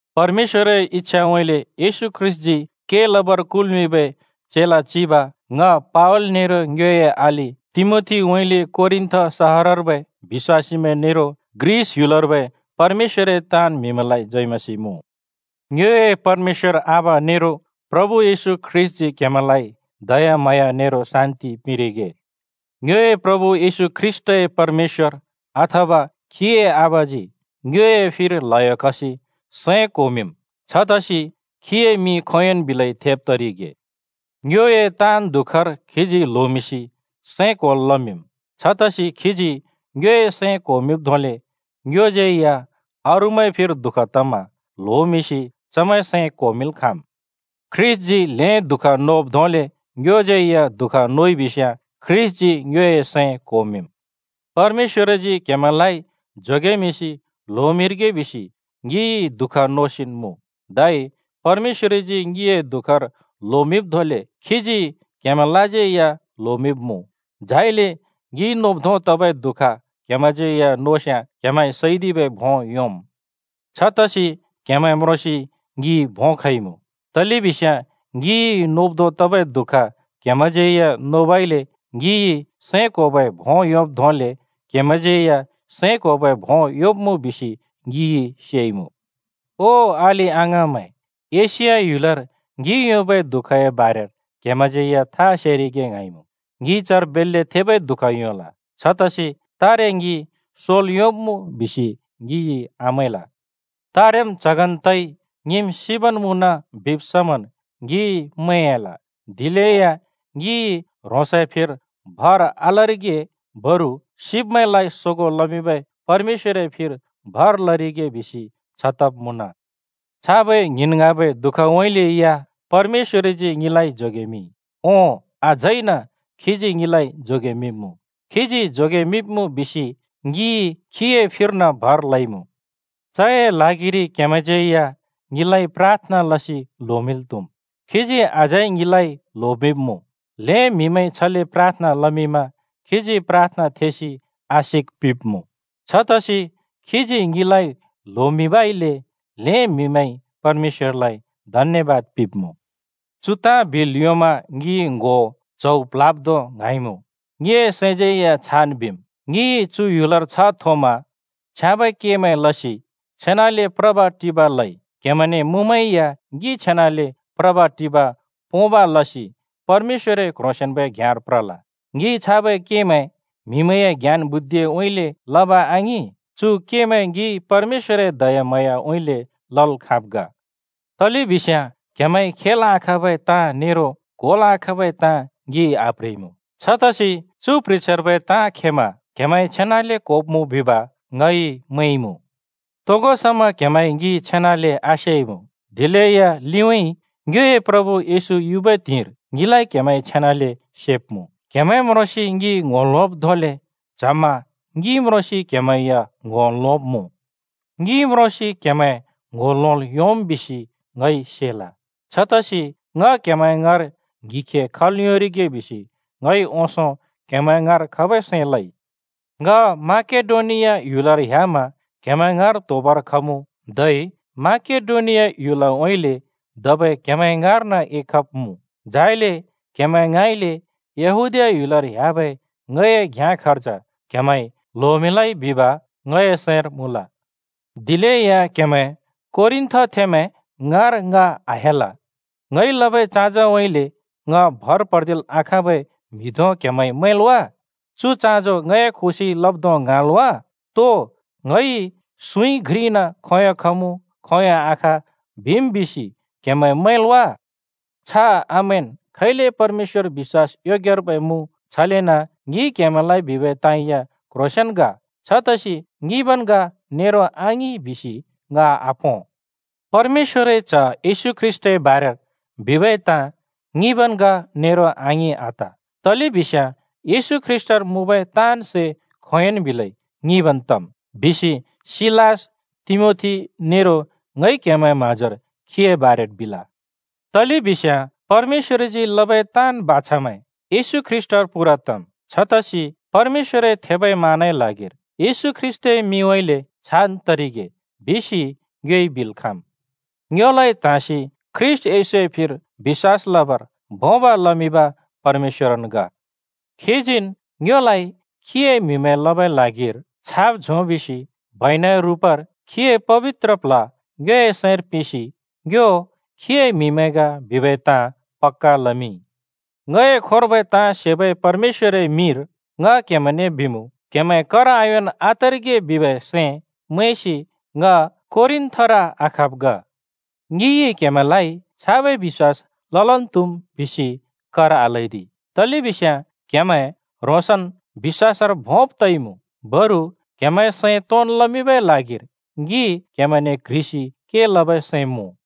परमेश्‍वरए इच्‍छाउँइँले येशू ख्रीष्‍टजी के लबर कुल्मिंबै चेला चिब ङ पावल नेरो ङ्योए अलि तिमोथीउँइँले कोरिन्‍थ सहरर्बै बिश्‍वासीमैं नेरो ग्रिस ह्‍युलर्बै परमेश्‍वरए ताँन् म्‍हिमैंलाइ जय मसीह मुँ। ङ्योए परमेश्‍वर आबा नेरो प्रभु येशू ख्रीष्‍टजी क्हेमैंलाइ दयाम्हाँया नेरो शान्ति पिंरिगे। ङ्योए प्रभु येशू ख्रीष्‍टए परमेश्‍वर, अथवा खीए आबाजी ङ्योए फिर ल्हयो खसि सैं क्होमिंम्। छतसि खीए मिं खोंयोंन् बिलेया थेब तरिगे। ङ्योए ताँन् दुःखर खीजी ल्होमिंसि सैं क्‍होल् लमिंम्। छतसि खीजी ङ्योए सैं क्‍होमिंब् धोंले ङ्योज्‍यै या अरूमैंए फिर दुःख तमा ल्होमिंसि चमैंए सैं क्‍होमिंल् खाँम्। ख्रीष्‍टजी ल्हें दुःख नोब् धोंले ङ्योज्यै या दुःख नोइबिस्‍याँ ख्रीष्‍टजी ङ्योए सैं क्होमिंम्। परमेश्‍वरजी क्हेमैंलाइ जोगेमिंसि ल्होमिंरिगे बिसि ङिइ दुःख नोसिन् मुँ। धै परमेश्‍वरजी ङिए दुःखर ल्होमिंब् धोंले खीजी क्हेमैंलाज्यै या ल्होमिंब्मुँ, झाइले ङिइ नोब् धों तबै दुःख क्हेमैंज्यै या नोस्याँ क्‍हेमैंइ सैदिबै भों योंम्। छतसि क्‍हेमैं म्रोंसि ङि भों खइमुँ, तलेबिस्याँ ङिइ नोब् धों तबै दुःख क्‍हेमैंज्‍यै नोबइले ङिइ सैं क्होबै भों योंब् धोंले क्‍हेमैंज्‍यै या सैं क्होबै भों योंब्मुँ बिसि ङिइ सेइमुँ। ओ अलि-अङाँमैं, एशिया ह्‍युलर ङिइ योंबै दुःखए बारेर क्‍हेमैंज्यै था सेरिगे ङ्हाँइमुँ। ङिइ चर बेल्‍ले थेबै दुःख योंल। छतसि तारे ङि सोल् योंब्मुँ बिसि ङिइ आमैंल। तारेम् च्हगन् तइ ङिम् सिबन् मुँन बिब् समन् ङिइ मैंयाल। दिलेया ङिइ ह्रोंसए फिर भर आलरिगे बरु सिब्‍मैंलाइ सोगों लमिंबै परमेश्‍वरए फिर भर लरिगे बिसि छ तब् मुँन। छाबै ङ्हिंन् ङ्हाँबै दुःखउँइँले या परमेश्‍वरजी ङिलाइ जोगेमिंइ। ओं, अझैन खीजी ङिलाइ जोगेमिंब्मुँ। खीजी जोगेमिंब्मुँ बिसि ङिइ खीए फिर्न भर लइमुँ। चए ल्हागिरि क्‍हेमैंज्‍यै या ङिलाइ प्राथना लसि ल्होमिंल् त्हुम्। खीजी अझै ङिलाइ ल्होमिंब्‍मुँ। ल्हें म्‍हिमैंइ छले प्राथना लमिंमा खीजी प्राथना थेसि आशिक पिंब्‍मुँ। छतसि खीजी ङिलाइ ल्होमिंबइले ल्हें म्‍हिमैंइ परमेश्‍वरलाइ धन्‍यबाद पिंब्‍मुँ। चु ताँ बिल् योंमा ङि ङ्‍हो च्हौ प्ल्ह्‍याब् धों ङ्हाँइमुँ, ङिए सैंज्यै या छान् बिम्। ङिइ चु ह्‍युलर छ्ह थोमा छ्याँबै केमैं लसि छेनाले प्रब्-टिब लइ, क्‍हेमैंने मुँमै या ङि छेनाले प्रब्-टिब पोंब लसि परमेश्‍वरए क्‍ह्रोंसेंन्बै घ्याँर प्रल। ङिइ छाबै केमैं म्‍हिए ज्ञान बुद्धिउँइँले लब आङिं, चु केमैं ङिइ परमेश्‍वरए दयाम्हाँयाउँइँले लल् खाँब् ग। तलेबिस्याँ क्हेमैंइ खेल् आखाँबै ताँ नेरो क्होल् आखाँबै ताँ ङिइ आप्ह्रिइमुँ। छतसि चु प्ह्रिछ्यार्बै ताँ खेमा क्हेमैंइ छेनाले क्‍होब्मुँ बिब ङइ मैंइमुँ। तोगो समा क्‍हेमैंइ ङि छेनाले आसेइमुँ, दिलेया लिउँइँ ङ्योए प्रभु येशू युबै त्हिंइर ङिलाइ क्‍हेमैंइ छेनाले सेब्मुँ। क्हेमैं म्रोंसि ङि ङ्‍हो लोंब् धोंले च्हमा ङि म्रोंसि क्हेमैं या ङ्‍हो लोंब्मुँ। ङि म्रोंसि क्हेमैं ङ्‍हो लोंल् योंम् बिसि ङइ सेल। छतसि ङ क्‍हेमैं ङाँर ङ्हिखे खल् योंरिगे बिसि ङइ ओंसों क्‍हेमैं ङाँर खबै सैं लइ। ङ माकेडोनिया ह्‍युलर ह्‍यामा क्हेमैं ङाँर त्होबर खमुँ, धै माकेडोनियाउँइँले धबै क्‍हेमैं ङाँर्न एखब्मुँ, झाइले क्‍हेमैं ङाँइले यहूदीया ह्‍युलर ह्‍याबै ङए घ्याँ खर्ज क्हेमैंइ ल्होमिंलै बिब ङए सैंर मुँल। दिलेया क्हेमैं कोरिन्थथेंमैं ङाँर ङ आह्‍याल। ङइ लबै चाँजोउँइँले ङ भर पर्दिल् आखाँबै म्हि धों क्हेमैंइ मैंल् वा? चु चाँजो ङए खुशिइ लब् धों ङ्हाँल् वा? तो ङइ सुँइ घ्रिइन खोंयों “खमुँ” खोंयों “आख” बिम् बिसि क्हेमैं मैंल् वा? छ आमैंन्! खैले परमेश्‍वर बिश्‍वास योग्यर्बै मुँ, छलेन ङिइ क्‍हेमैंलाइ बिबै ताँ या क्‍ह्रोंसेंन् ग। छतसि “ङिंबन् ग” नेरो “आङिं” बिसि ङ आपों। परमेश्‍वरए च्‍ह येशू ख्रीष्‍टए बारेर बिबै ताँ “ङिंबन् ग” नेरो “आङिं” आत। तलेबिस्याँ येशू ख्रीष्‍टर मुँबै ताँन् सै खोंयोंन् बिलै “ङिंबन् तम्” बिसि सिलास, तिमोथी नेरो ङइ क्हेमैंए म्हाँजोर खीए बारेर बिल। तलेबिस्याँ परमेश्‍वरजी लबै ताँन् बाछामैं येशू ख्रीष्‍टर पूरा तम्। छतसि परमेश्‍वरए थेबै मानए ल्हागिर “येशू ख्रीष्‍टए मिंउँइँले छान् तरिगे” बिसि ङ्योइ बिल् खाँम्। ङ्योलाइ त्‍हाँसि ख्रीष्‍ट येशूए फिर बिश्‍वास लबर भोंब लमिंब परमेश्‍वरन् ग। खीजीन् ङ्योलाइ खीए म्‍हिमैं लबै ल्हागिर छाप झोंमिंसि बैनाए रुपर खीए पबित्र प्ल्ह ङ्योए सैंर पिंसि ङ्यो खीए म्हिमैं ग बिबै ताँ पक्‍का लमिंइ। ङए खोंर्बै ताँ सेबै परमेश्‍वरए मिंर ङ क्हेमैंने बिमुँ: क्‍हेमैं कर आयोंन् आतरिगे बिबै सैं मैंसि ङ कोरिन्‍थर आखब् ग। ङिइ क्‍हेमैंलाइ “छाबै बिश्‍वास ललन् त्‍हुम्” बिसि कर आल्‍हैदि, तलेबिस्याँ क्‍हेमैं ह्रोंसन् बिश्‍वासर भोंब तइमुँ। बरु क्‍हेमैंए सैं तोंन् लमिंबै ल्हागिर ङि क्‍हेमैंने क्ह्रिसि के लबै सैं मुँ।